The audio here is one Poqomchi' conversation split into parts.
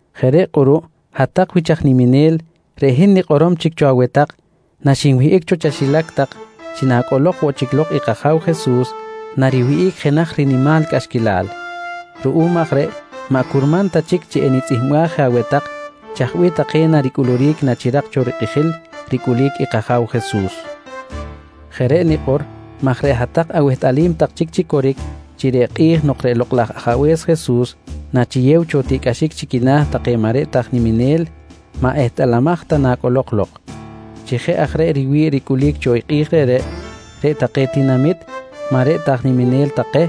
Jeꞌ reꞌ kꞌuruꞌ hat-tak wich aj niminel, reꞌ hin nikꞌorom chic cho aweh tak naxinwihꞌic cho chaxilac tak chi nacꞌolok woꞌ chic lok i kAja̱w Jesus, nariwihꞌic jenaj nimal cꞌaxquilal. Ruꞌum aj reꞌ maꞌ curman ta chic chi enitzꞌihmbaj je aweh tak chaj bih take naricꞌuluric nachirak cho rikꞌijil ricꞌulic i kAja̱w Jesus. Jeꞌ reꞌ nikꞌor maj reꞌ hat-tak awehtꞌalim tak chic chi coric chi reꞌ kꞌi̱j nok reꞌ Lokꞌ laj Ajabe̱s Jesus nachiyew cho tiꞌcꞌaxic chi quina̱ take maꞌ reꞌ ta aj niminel, maꞌ ehtꞌalamaj ta nacꞌolok lok. Chi jeꞌ aj reꞌ riwi̱ꞌ ricꞌulic cho kꞌi̱j reꞌreꞌ, reꞌ take tinamit maꞌ reꞌ ta aj niminel take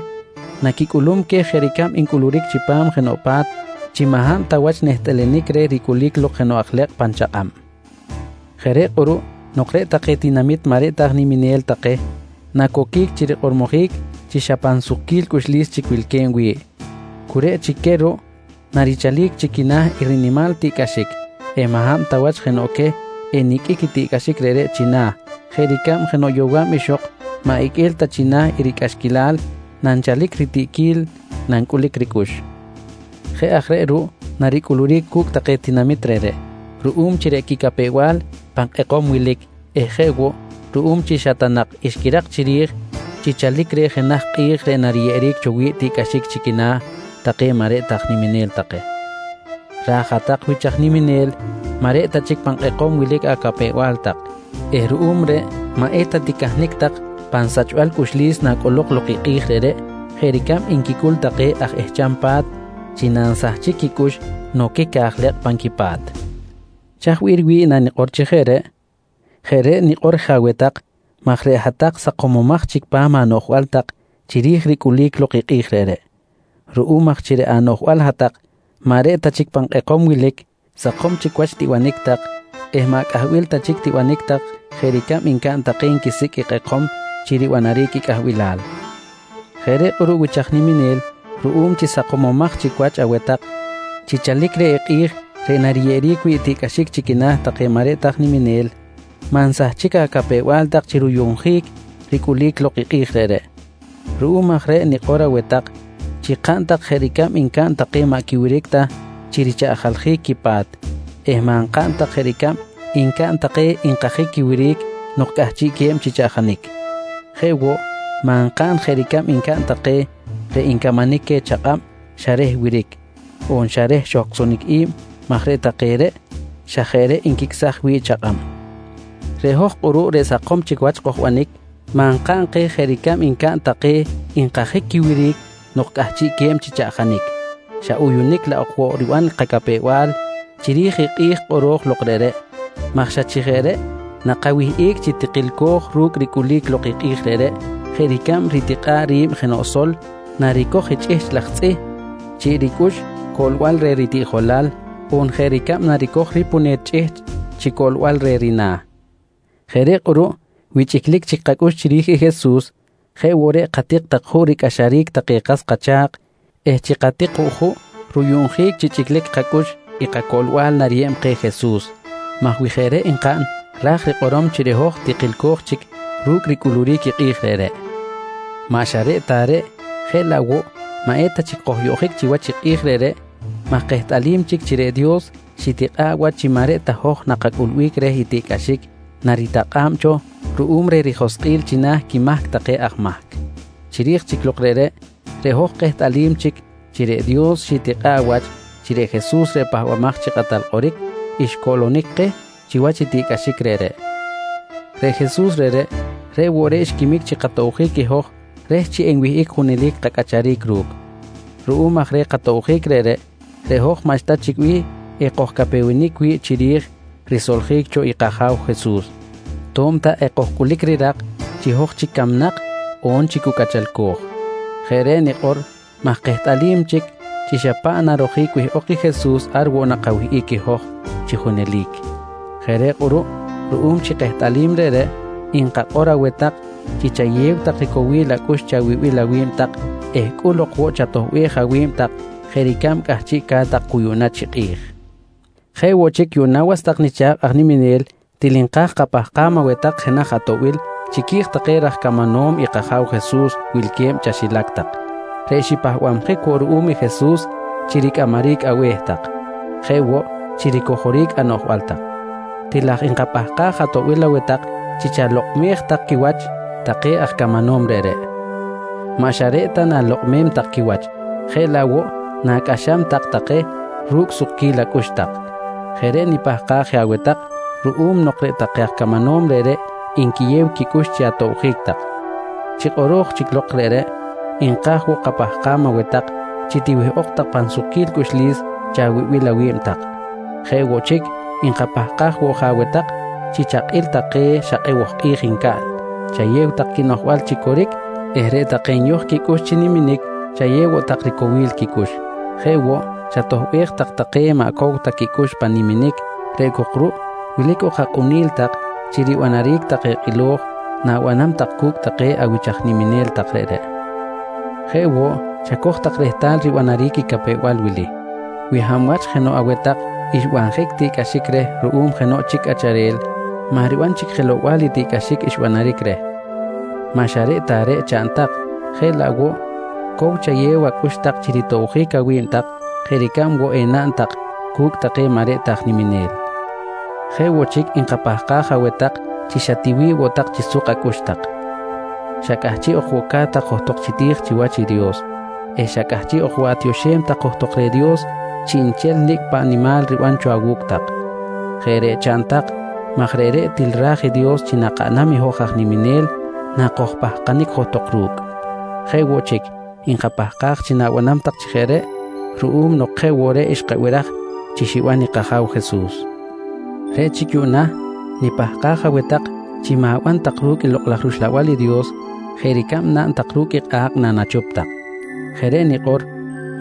naquicꞌulum queh jeꞌ ricab ncꞌuluric chipam jenoꞌ pa̱t chi maꞌ hab ta wach nehtꞌalanic reh ricꞌulic lok jenoꞌ aj lekꞌ pan chakꞌab. Jeꞌ reꞌ kꞌuruꞌ nok reꞌ take tinamit maꞌ reꞌ ta aj niminel take nacoquic chi rikꞌormojic chi xa pan sukquil cꞌuxlis chic wilque̱b wi̱ꞌ, cu reꞌ chic queh ruꞌ narichalic chi quina̱ i rinimal tiꞌcꞌaxic eh maꞌ hab ta wach jenoꞌ queh eniqꞌuic i tiꞌcꞌaxic reꞌreꞌ china̱ jeꞌ ricab jenoꞌ yowa̱b ixok maꞌ iqꞌue̱l ta china̱ i ricꞌaxquilal nanchalic ritiꞌquil nancꞌulic ricꞌux. Jeꞌ aj reꞌ ruꞌ naricꞌuluric cu̱cꞌ take tinamit reꞌreꞌ, ruꞌum chi reꞌ quicapew-bal pan kꞌekom wilic eh jeꞌ woꞌ ruꞌum chi xa ta nak xquirak chiri̱j chi chalic reh jenaj kꞌi̱j reꞌ nariyeꞌeric cho wi̱ꞌ tiꞌcꞌaxic chi quina̱ take maꞌ reꞌ ta aj niminel take. Raj i hat-tak wich aj niminel maꞌ reꞌ ta chic pan kꞌekom wilic acapew-bal tak eh ruꞌum reꞌ maꞌ eta ticahnic tak pan sachbal cꞌuxlis nacꞌolok lok i kꞌi̱j reꞌreꞌ jeꞌ ricab nquicꞌul take aj ehcham pa̱t chi nansahchic quicꞌux noquic aj lekꞌ pan quipa̱t. Chaj bih riwi̱ꞌ nanikꞌor chi jeꞌ reꞌreꞌ? Jeꞌ reꞌ nikꞌor je aweh tak maj reꞌ hat-tak sakomomaj chic pa̱m anoꞌjbal tak chiri̱j ricꞌulic lok i kꞌi̱j reꞌreꞌ. Ruꞌum aj chi reꞌ anoꞌjbal hat-tak maꞌ reꞌ ta chic pan kꞌekom wilic, sakom chic wach tibanic tak eh maꞌ cꞌahbil ta chic tibanic tak jeꞌ ricab ncaꞌn take nquisicꞌ i kꞌekom chi ribanaric i cꞌahbilal. Jeꞌ reꞌ kꞌuruꞌ wich aj niminel, ruꞌum chi sakomomaj chic wach aweh tak chi chalic reh i kꞌi̱j reꞌ nariyeꞌeric wi̱ꞌ tiꞌcꞌaxic chi quina̱ take maꞌ reꞌ ta aj niminel, maꞌ nsahchic acapew-bal tak chi ruyuꞌnjic ricꞌulic lok i kꞌi̱j reꞌreꞌ. Ruꞌum aj reꞌ nikꞌor aweh tak chi kaꞌn tak jeꞌ ricab ncaꞌn take maꞌ quiwiric ta chi richaꞌjaljic quipa̱t eh maꞌ nkaꞌn tak jeꞌ ricab ncaꞌn take nkajic quiwiric nok cꞌahchiꞌque̱b chi chaꞌjanic. Jeꞌ woꞌ, maꞌ nkaꞌn jeꞌ ricab ncaꞌn take reꞌ ncamanic queh chakꞌab xa reh wiric, on xa reh xohcꞌsonic i̱b maj reꞌ take reꞌ xa jeꞌ reꞌ nquicꞌsaj wi̱ꞌ chakꞌab. Reꞌ hoj kꞌuruꞌ reꞌ sakom wach kojbanic, maꞌ nkaꞌn jeꞌ ricab ncaꞌn take nkajic quiwiric nok cꞌahchiꞌ que̱b chi chaꞌjanic, xa uyunic laꞌ ok woꞌ riban kacapew-bal chiri̱j i kꞌi̱j kꞌoro̱j lok reꞌreꞌ maj xa chi jeꞌ reꞌ nakawihꞌic chi tikilco̱j ru̱cꞌ ricꞌulic lok i kꞌi̱j reꞌreꞌ jeꞌ ricab ritikꞌa̱ꞌ ri̱b jenoꞌ sol naricoj i chꞌihchꞌ laj tzꞌih chiꞌ ricꞌux coꞌlbal reh ritiꞌjolal, on jeꞌ ricab naricoj ripune̱t chꞌihchꞌ chi coꞌlbal reh rina̱. Jeꞌ reꞌ kꞌuruꞌ wi chꞌiclic chic kacꞌux chiri̱j i Jesus, jeꞌ woꞌ reꞌ katik tak juꞌ ricꞌaxaric take kas kacha̱kꞌ eh chi katik woꞌ juꞌ ruyuꞌnjic chi chꞌiclic kacꞌux i kacoꞌlbal nariyeb keh Jesus maj wi jeꞌ reꞌ nkaꞌn ra̱j rikꞌorom chi reꞌ hoj tikilco̱j chic ru̱cꞌ ricꞌulic lok i kꞌi̱j reꞌreꞌ. Maꞌ xa reꞌ ta reꞌ, jeꞌ laꞌ woꞌ maꞌ eta chic kojyoꞌjic chiwach i kꞌi̱j reꞌreꞌ maj kehtꞌalim chic chi reꞌ Dios xitikꞌa̱ꞌ wach chi maꞌ reꞌ ta hoj nakacꞌulbic reh i tiꞌcꞌaxic naritakꞌa̱b cho ruꞌum reh rijoskꞌil china̱ quimahc take aj mahc. Chiri̱j chic lok reꞌreꞌ, reꞌ hoj kehtꞌalim chic chi reꞌ Dios xitikꞌa̱ꞌ wach chi reꞌ Jesus reꞌ Pahbamaj chi Kꞌatal Kꞌoric, xcoꞌlonic keh chiwach i tiꞌcꞌaxic reꞌreꞌ. Reꞌ Jesus reꞌreꞌ, reꞌ woꞌ reꞌ xquimic chi katobjic i hoj reh chi enwihꞌic junelic kacꞌacharic ru̱cꞌ. Ruꞌum aj reh katobjic reꞌreꞌ, reꞌ hoj maꞌxta bih enkojcapewenic wi̱ꞌ chiri̱j risoljic cho kAja̱w Jesus to̱b ta ekojcꞌulic rirak chi hoj chic camnak on chi cu cꞌachalco̱j. Jeꞌ reꞌ nikꞌor maj kehtꞌalim chic chi xa paꞌ narojic wihꞌok i Jesus ar woꞌ nakawihꞌic i hoj chi junelic. Jeꞌ reꞌ kꞌuruꞌ ruꞌum chi kehtꞌalim reꞌreꞌ, nkakꞌor aweh tak chi chayew tak ricowil acꞌux chawibil awi̱b tak eh cꞌul ok woꞌ chatoꞌbej awi̱b tak jeꞌ ricab cꞌahchiꞌca̱t tak cu yuꞌna chi kꞌi̱j. Jeꞌ woꞌ chic yuꞌna was tak nicha̱kꞌ aj niminel, til nka̱j kapahkam aweh tak jenaj atoꞌbil chiqui̱j take raj camanom i kAja̱w Jesus wilque̱b chaxilac tak reꞌ xipahbabjic woꞌ ruꞌum i Jesus chi ricꞌamaric abe̱h tak, jeꞌ woꞌ chi ricojoric anoꞌjbal tak. Til aj nkapahkaj atoꞌbil aweh tak chi chalokꞌmej tak quiwach take aj camanom reꞌreꞌ. Maꞌ xa reꞌ ta na̱lokꞌmem tak quiwach, jeꞌ laꞌ woꞌ nacꞌaxam tak take ru̱cꞌ sukquil acꞌux tak. Jeꞌ reꞌ nipahkaj je aweh tak ruꞌum nok reꞌ take aj camanom reꞌreꞌ nquiyew quicꞌux chi atobjic tak. Chi kꞌoro̱j aj chic lok reꞌreꞌ, nka̱j woꞌ kapahkam aweh tak chi tiwihꞌok tak pan sukquil cꞌuxlis chawibil awi̱b tak. Jeꞌ woꞌ chic, nkapahkaj woꞌ je aweh tak chi chakꞌil tak take xa kꞌeboj kꞌi̱j ncaꞌn, chayew tak quinoꞌjbal chi coric eh reꞌ take nyoj quicꞌux chi niminic chayew woꞌ tak ricowil quicꞌux. Jeꞌ woꞌ, chatoꞌbej tak take maꞌ cow ta quicꞌux pan niminic, reꞌ cok ruꞌ wilic ok akꞌunil tak chi ribanaric take kꞌilo̱j na̱banam tak cu̱cꞌ take awich aj niminel tak reꞌreꞌ. Jeꞌ woꞌ, chacoj tak rehtal ribanaric i capew-bal wili: Wi hab wach jenoꞌ aweh tak xbanjic tiꞌcꞌaxic reh ruꞌum jenoꞌ chic cꞌacharel, maꞌ riban chic jelow-bal i tiꞌcꞌaxic xbanaric reh. Maꞌ xa reꞌ ta reꞌ chaꞌn tak, jeꞌ laꞌ woꞌ cow chayew acꞌux tak chi ritobjic awi̱b tak jeꞌ ricab woꞌ enaꞌn tak cu̱cꞌ take maꞌ reꞌ ta aj niminel. Jeꞌ woꞌ chic, nkapahkaj aweh tak chi xa tiwi̱ꞌ woꞌ tak chi suk acꞌux tak, xa cꞌahchiꞌ ok woꞌ ca̱t tak johtok chi ti̱j chiwach i Dios eh xa cꞌahchiꞌ ok woꞌ atioxem tak johtok reh i Dios chiꞌnchel nicꞌ paꞌ nimal riban cho awu̱cꞌ tak. Jeꞌ reꞌ chaꞌn tak maj reꞌreꞌ til ra̱j i Dios chi nakaꞌnam i hoj aj niminel nakojpahkanic johtok ru̱cꞌ. Jeꞌ woꞌ chic, nkapahkaj chi na̱banam tak chi jeꞌ reꞌ ruꞌum nok jeꞌ woꞌ reꞌ xkabiraj chi xiban i kAja̱w Jesus. Reꞌ chic yuꞌna nipahkaj aweh tak chi ma̱ban tak ru̱cꞌ i Lokꞌ laj rUxlabal i Dios jeꞌ ricab naꞌn ru̱cꞌ i kꞌa̱kꞌ nanachup tak. Jeꞌ reꞌ nikꞌor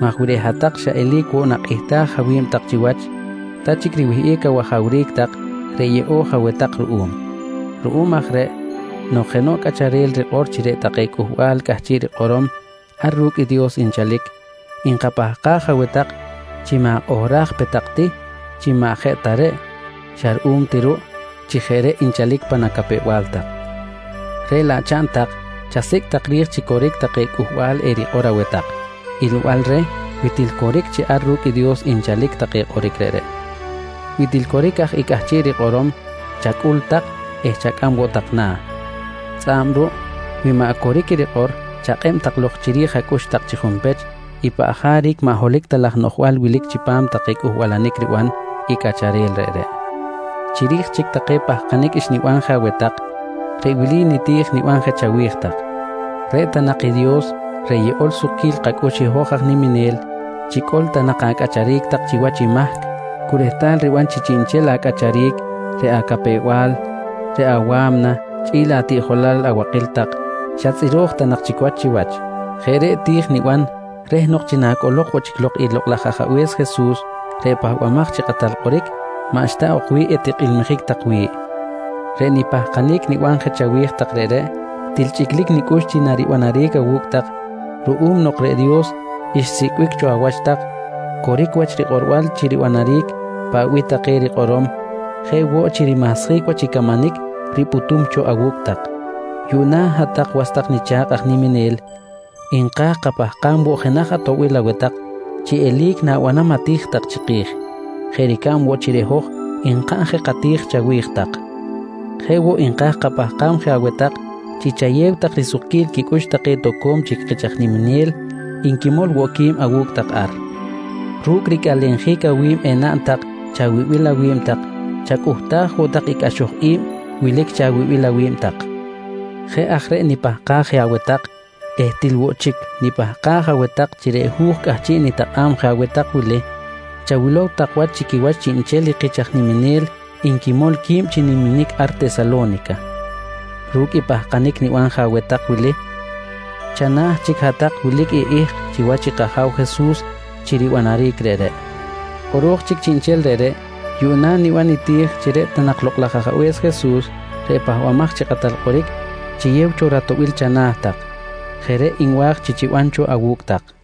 maj wi reꞌ hat-tak xa eli̱c woꞌ nakꞌihtaj awi̱b tak chiwach, ta chic riwihꞌic awajawric tak reꞌ yeꞌo̱j aweh tak ruꞌum. Ruꞌum aj reꞌ nok jenoꞌ cꞌacharel rikꞌor chi reꞌ take cꞌuhbal cꞌahchiꞌ rikꞌorom ar ru̱cꞌ i Dios nchalic, nkapahkaj aweh tak chi ma̱kꞌohraj pe tak ti chi maꞌ jeꞌ ta reꞌ xa ruꞌum ti ruꞌ chi jeꞌ reꞌ nchalic pan acapew-bal tak. Reꞌ laꞌ chaꞌn tak, chasicꞌ tak ri̱j chi coric take cꞌuhbal erikꞌor aweh tak, ilbal reh wi til coric chi ar ru̱cꞌ i Dios nchalic take kꞌoric reꞌreꞌ. Wi til coric aj i cꞌahchiꞌ rikꞌorom, chacꞌul tak eh chacꞌam woꞌ tak na̱. Tzꞌa̱b ruꞌ wi maꞌ coric i rikꞌor, chakꞌeb tak lok chiri̱j acꞌux tak chi junpech i paꞌ jaric maꞌ holohic ta laj noꞌjbal wilic chipam take cꞌuhbalanic riban i cꞌacharel reꞌreꞌ. Chiri̱j chic take pahkanic xniban je aweh tak, reꞌ wili niti̱j niban je chawi̱j tak: Reꞌ ta nak i Dios reꞌ yeꞌol sukquil kacꞌux i hoj aj niminel, chicꞌol ta nak acꞌacharic tak chiwach i mahc cu rehtal riban chi chiꞌnchel acꞌacharic, reꞌ acapew-bal, reꞌ awa̱mna chꞌi̱l atiꞌjolal abakil tak, xa tzꞌiro̱j ta nak chic wach chiwach. Jeꞌ reꞌ ti̱j niban reh nok chi nacꞌolok woꞌ chic lok i Lokꞌ laj Ajabe̱s Jesus reꞌ Pahbamaj chi Kꞌatal Kꞌoric, maꞌxta ok bih etikꞌilmijic tak wi̱ꞌ. Reꞌ nipahkanic niban je chawi̱j tak reꞌreꞌ, til chꞌiclic nicꞌux chi naribanaric awu̱cꞌ tak ruꞌum nok reꞌ Dios xsicꞌbic cho awach tak, coric wach rikꞌorbal chi ribanaric paꞌ bih take rikꞌorom jeꞌ woꞌ chi rimahsjic wach i camanic ripꞌutum cho awu̱cꞌ tak. Yuꞌna hat-tak was tak nicha̱kꞌ aj niminel, nka̱j kapahkam woꞌ jenaj atoꞌbil aweh tak chi eli̱c na̱banam ati̱j tak chiki̱j, jeꞌ ricab woꞌ chi reꞌ hoj nkaꞌn je kati̱j chawi̱j tak. Jeꞌ woꞌ, nka̱j kapahkam je aweh tak chi chayew tak risukquil quicꞌux take toco̱m chic kich aj niminel nquimol woꞌ qui̱b awu̱cꞌ tak ar. Ru̱cꞌ ricꞌalenjic awi̱b enaꞌn tak chawibil awi̱b tak, chacꞌuhtaj woꞌ tak i cꞌaxoj i̱b wilic chawibil awi̱b tak. Jeꞌ aj reꞌ nipahkaj je aweh tak eh til woꞌ chic nipahkaj aweh tak chi reꞌ hu̱j cꞌahchiꞌ nitakꞌa̱b je aweh tak wili chawilow tak wach chi quiwach chiꞌnchel i kich aj niminel nquimol qui̱b chi niminic ar Tesalo̱nica. Ru̱cꞌ i pahkanic niban je aweh tak wili, chana̱ chic hat-tak wilic i ihk chiwach i kAja̱w Jesus chi ribanaric reꞌreꞌ. Kꞌoro̱j chic chiꞌnchel reꞌreꞌ, yuꞌna niban niti̱j chi reꞌ ta Lokꞌ laj Ajabe̱s Jesus reꞌ Pahbamaj chi Kꞌatal Kꞌoric chiyew cho ratoꞌbil chana̱ tak. Jeꞌ reꞌ nwa̱j chi chiban cho awu̱cꞌ tak.